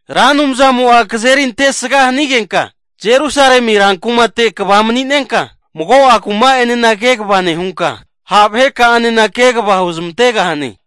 Ra Anumzamo'a kazeri antesga hanigenka Jerusalemi rankumate kva mani'nenka, mago'a kuma'enena kegava nehunka, ha vaheka'anena kegava huzmantegahane.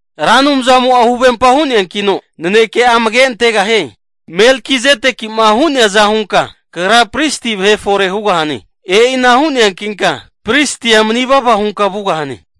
Ra Anumzamo'a huvempa hu'neankino naneke'a amage antegahie. Melkizedeki'ma hu'neaza hunka Kagra pristi vahe fore hugahane. E'ina hu'neankinka pristia manivava hunka vugahane.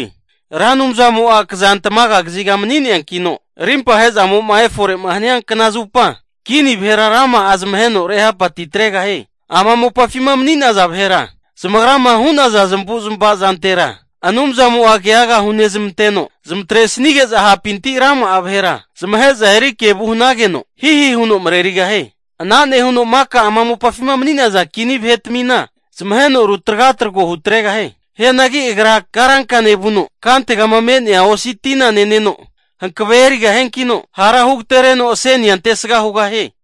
Ra Anumzamo'a kazantamaga kaziga mani'neankino, arimpahe zamo'ma efore hania knazupa, kini vahera rama'a zamaheno rehapatitregahie. Ama mopafima mani'naza vahera, zamagrama hu'naza zamavu'zmava zantera Anumzamo'a keaga hunezmanteno, zamatresnige'za hapinti rama'a vahera zamahe'za eri kevu hanageno hihi huno marerigahie. Ana nehuno maka ama mopafima mani'naza kini vahetamina zamaheno rutragatrago hutregahie. Hianagi agra karanka nevuno, kantegama me'nea osi tina neneno hankavea erigahiankino hara hu agatereno asenia antesga hugahie.